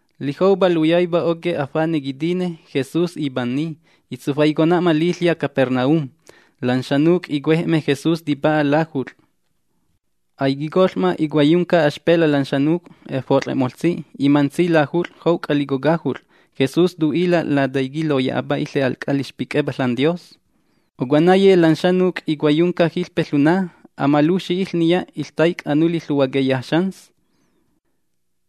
Lijoupa luyaipa oquej fanej quitine, Jesús ipainanni, itsufaicona'ma liƚya' Capernaum. Lan xanuc' icuej'me Jesús tipa'a lajut'ƚ. Aiquicoƚ'ma icuaiyunca axpela' lan xanuc', efot'ƚe'moƚtsi. Imantsi lajut'ƚ jouc'a lico cajut'ƚ. Jesús tu'ila' Lataiqui' loya'apa iƚe al c'a lixpic'epa ȽanDios. Ocuenaye lan xanuc' icuaiyunca jiƚpe ƚuna. Amalujxi iƚniya iƚtaic' anuli ƚuhuaqueya xans.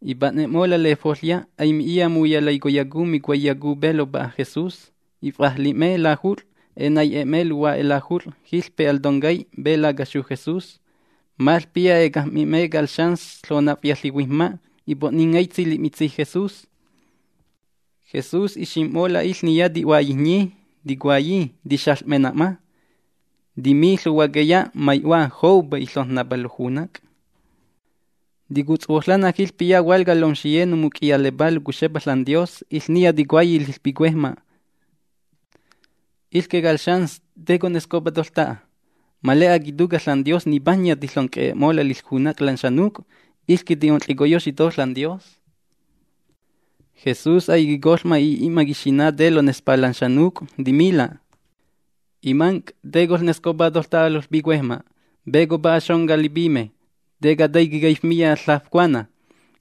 Ipa'ne'mola' lefoƚya, aimi'iya muyalaicoyacu, micuaiyacu pe lopa'a Jesús. If'ajli'me lajut'ƚ, enai'e'me luhua'e lajut'ƚ jiƚpe al toncay pe lacaxu Jesús. Maƚpiya ecajm'mi'me cal xans ƚonafya ƚihuijm‑ma', ipo'ningaitsi li'mitsi' Jesús. Jesús ixim'mola' iƚniya ti'huaiyijnyi, ticuayi: “Tixaƚ'mena'ma”. Timi ƚuhuaqueya: ―Mai'hua, joupa iƚojn‑napa lojunac'. Ticutshuoƚanna jiƚpiya hualca lomxiye nomuc'iyalepá locuxepa ȽanDios. Iƚniya ticuayi liƚpicuejma': “Iƚque cal xans, ¿te conescopa toƚta'a? Ma le'a quituca' ȽanDios nipajnya tiƚonc'e'e'mola' liƚjunac' lan xanuc'. Iƚque ti'onƚicoyoxi to ȽanDios.” Jesús aiquicoƚ'ma i'i'ma quixina' te lonespa lan xanuc'. Timila': ―Imanc', ¿te coƚnescopa toƚta'a loƚpicuejma'? ¿Pe copa'a xonca lipime? ¿Te cataiqui' caifmiya ƚafcuana?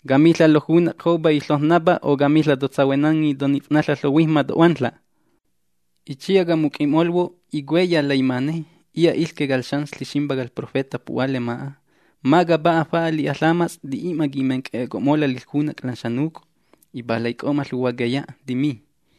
¿Camiƚa': “Lojunac' joupa iƚojn‑napa”, o camiƚa': “Totsahuenanni, tonif'naƚa' ƚohuijm‑ma', to'huanƚa'”? Itsiya camuc'i'molhuo' icueya laimane. Iya' iƚque cal Xans Ƚiximpa cal profeta pu'hua lema'a. Ma capa'a fa'a li'a ƚamats' ti'i'ma quimenc'e'eco'mola' liƚjunac' lan xanuc'. Ipalaic'o'ma ƚuhuaqueya, timi: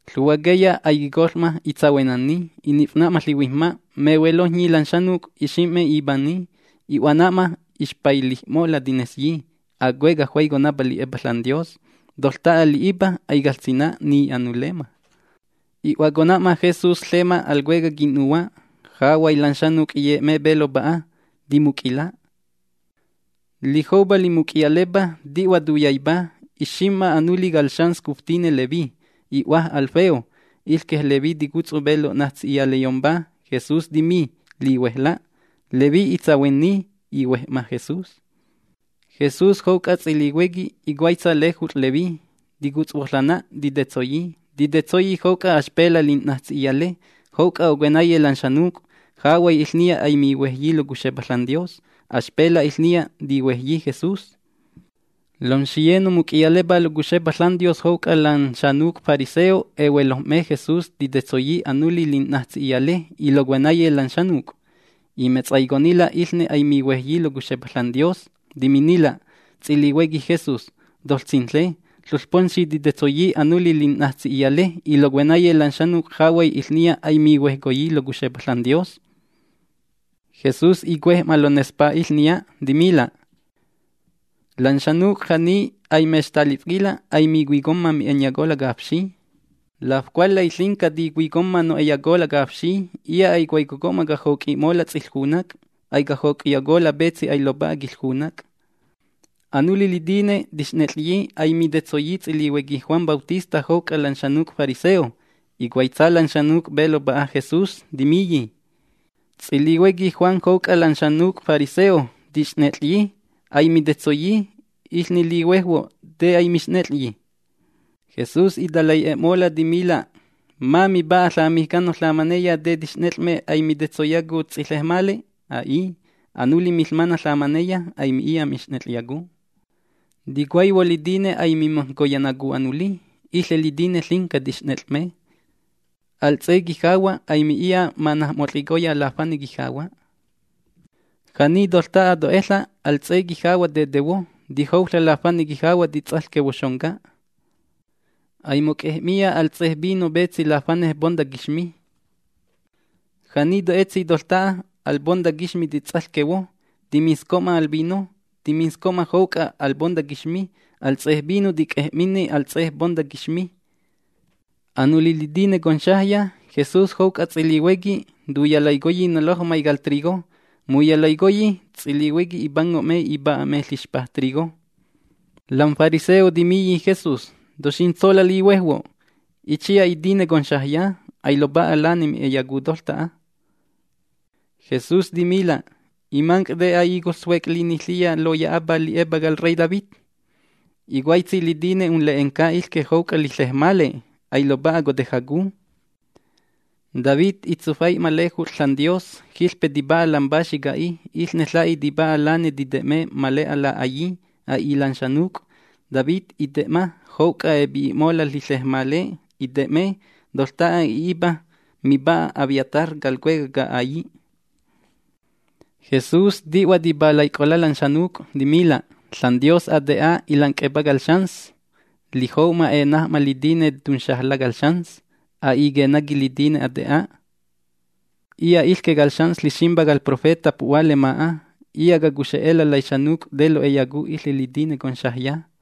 Ƚuhuaqueya aiquicoƚ'ma itsahuenanni, inif'ma ƚihuijm‑ma'. Mehuelojnyi lan xanuc', ixim'me ipanni, i'huana'ma. Ixpailij'mola', tinesyi: ―Acueca' juaiconapa li'epa ȽanDios. Toƚta'a li'ipa aicaƚsina', ni anulemma. I'huacona'ma Jesús ƚema al cuecaj quin'nuhua'. Jahuay lan xanuc' iye'me pe lopa'a. Timuc'ila'. Lijoupa limuc'iyalepa, ti'hua tuyaipa, ixim'ma anuli cal xans cuftine Leví, i'hua Alfeo. Iƚque Leví ticutsu petsi lo'najts'i'iyaleyompa. Jesús timi: ―Lihuejla'. Leví itsahuenni, ihuej'ma Jesús. Jesús jouc'a ts'ilihuequi icuaitsa lejut'ƚ Leví, ticutshuoƚanna, titetsoyi. Titetsoyi jouc'a axpela' lin'najtsi'iyale jouc'a ocuenaye lan xanuc'. Jahuay iƚniya a'i mihuejyi locuxepa ȽanDios. Axpela' iƚniya tihuejyi Jesús. Lomxiye nomuc'iyalepá locuxepa ȽanDios jouc'a lan xanuc' fariseo ehuelojm'me Jesús titetsoyi anuli lin'najts'i'iyale y locuenaye lan xanuc'. Imetsaiconnila' iƚne aimihuejyi locuxepa ȽanDios. Timinnila' ts'ilihuequi Jesús: ―Toƚsinƚe, ƚoƚpomxi titetsoyi anuli lin'najts'i'iyale y locuenaye lan xanuc'. Jahuay iƚniya aimihuejyi locuxepa ȽanDios. Jesús icuej'ma lonespa iƚniya. Timila': ―Lan xanuc' ja'ni a'i mextafquila' aimicuicomma mi'e'enyacola' cafxi. Lafcualƚay ƚinca ticuicomma no'eyacola' cafxi. Iya' aicuaicoco'ma cajoc'i'mola' ts'iƚjunac'. Aicajoc'iyacola' petsi ailopa'a quiƚjunac'. Anuli litine tixnet'ƚyi aimitetsoyi ts'ilihuequi Juan Bautista jouc'a lan xanuc' fariseo. Icuaitsa lan xanuc' pe lopa'a Jesús, timiyi: ―Ts'ilihuequi Juan jouc'a lan fariseo tixnet'ƚyi, aimitetsoyi. Iƚne lihuejhuo', ¿te aimixnet'ƚyi? Jesús italai'e'e'mola', timila': ―Ma mipa'a ƚamijcano ƚamaneya, ¿te tixnet'ƚ'me, aimitetsoyacu ts'iƚejmale? A'i. Anuli miƚmana' ƚamaneya, aimi'iya mixnet'ƚyacu. Ticuaihuo litine aimimajnconayacu anuli, iƚe litine ƚinca tixnet'ƚ'me. ’Al ts'e quijahua' aimi'iya manajmot'ƚicoya lafane quijahua'. Ja'ni toƚta'a to'eƚa', al ts'e quijahua' tetehuo, tijouƚa' lafane quijahua' tits'aƚquehuo xonca. Aimoc'ej'miya al ts'e vino petsi lafanej ponta quixmi. Ja'ni to'etsi toƚta'a, al ponta quixmi tits'aƚquehuo, timinsco'ma al vino, timinsco'ma jouc'a al ponta quixmi. Al ts'e vino tic'ej'minni al ts'e ponta quixmi. Anuli litine conxajya, Jesús jouc'a ts'ilihuequi tuyalaicoyi nolojmay cal trigo. Muyalaicoyi, ts'ilihuequi ipango'me ipa'a'me ƚixpaj trigo. Lam fariseo timiyi Jesús: ―¡Toxintsola' lihuejhuo'! Itsiya itine conxajya. Ailopa'a lane mi'eyacu toƚta'a. Jesús timila': ―Imanc', ¿te a'i coƚsuec' liniƚiya loya'apa li'epa cal rey David? Icuaitsi litine unle'enca iƚque jouc'a liƚejmale, ailopa'a cotejacu. David itsufai'ma lejut'ƚ ȽanDios. Jiƚpe tipa'a lam paxi ca'í. Iƚne la'í tipa'a lane tite'me ma le'a la'aillí, a'i lan xanuc'. David ite'ma jouc'a epi'i'mola' liƚejmale, ite'me. Toƚta'a i'ipa mipa'a Abiatar cal cuecaj ca'ailli'. Jesús ti'hua tipalaic'ola' lan xanuc', timila': ―ȽanDios ate'a ilanc'epa cal xans, lijou'ma enaj'ma litine tunxajla' cal xans. A'i quenaqui litine ate'a. Iya' iƚque cal Xans Ƚiximpa cal profeta pu'hua lema'a. Iya' cacuxe'ela' laixanuc' te lo'eyacu iƚe litine conxajya.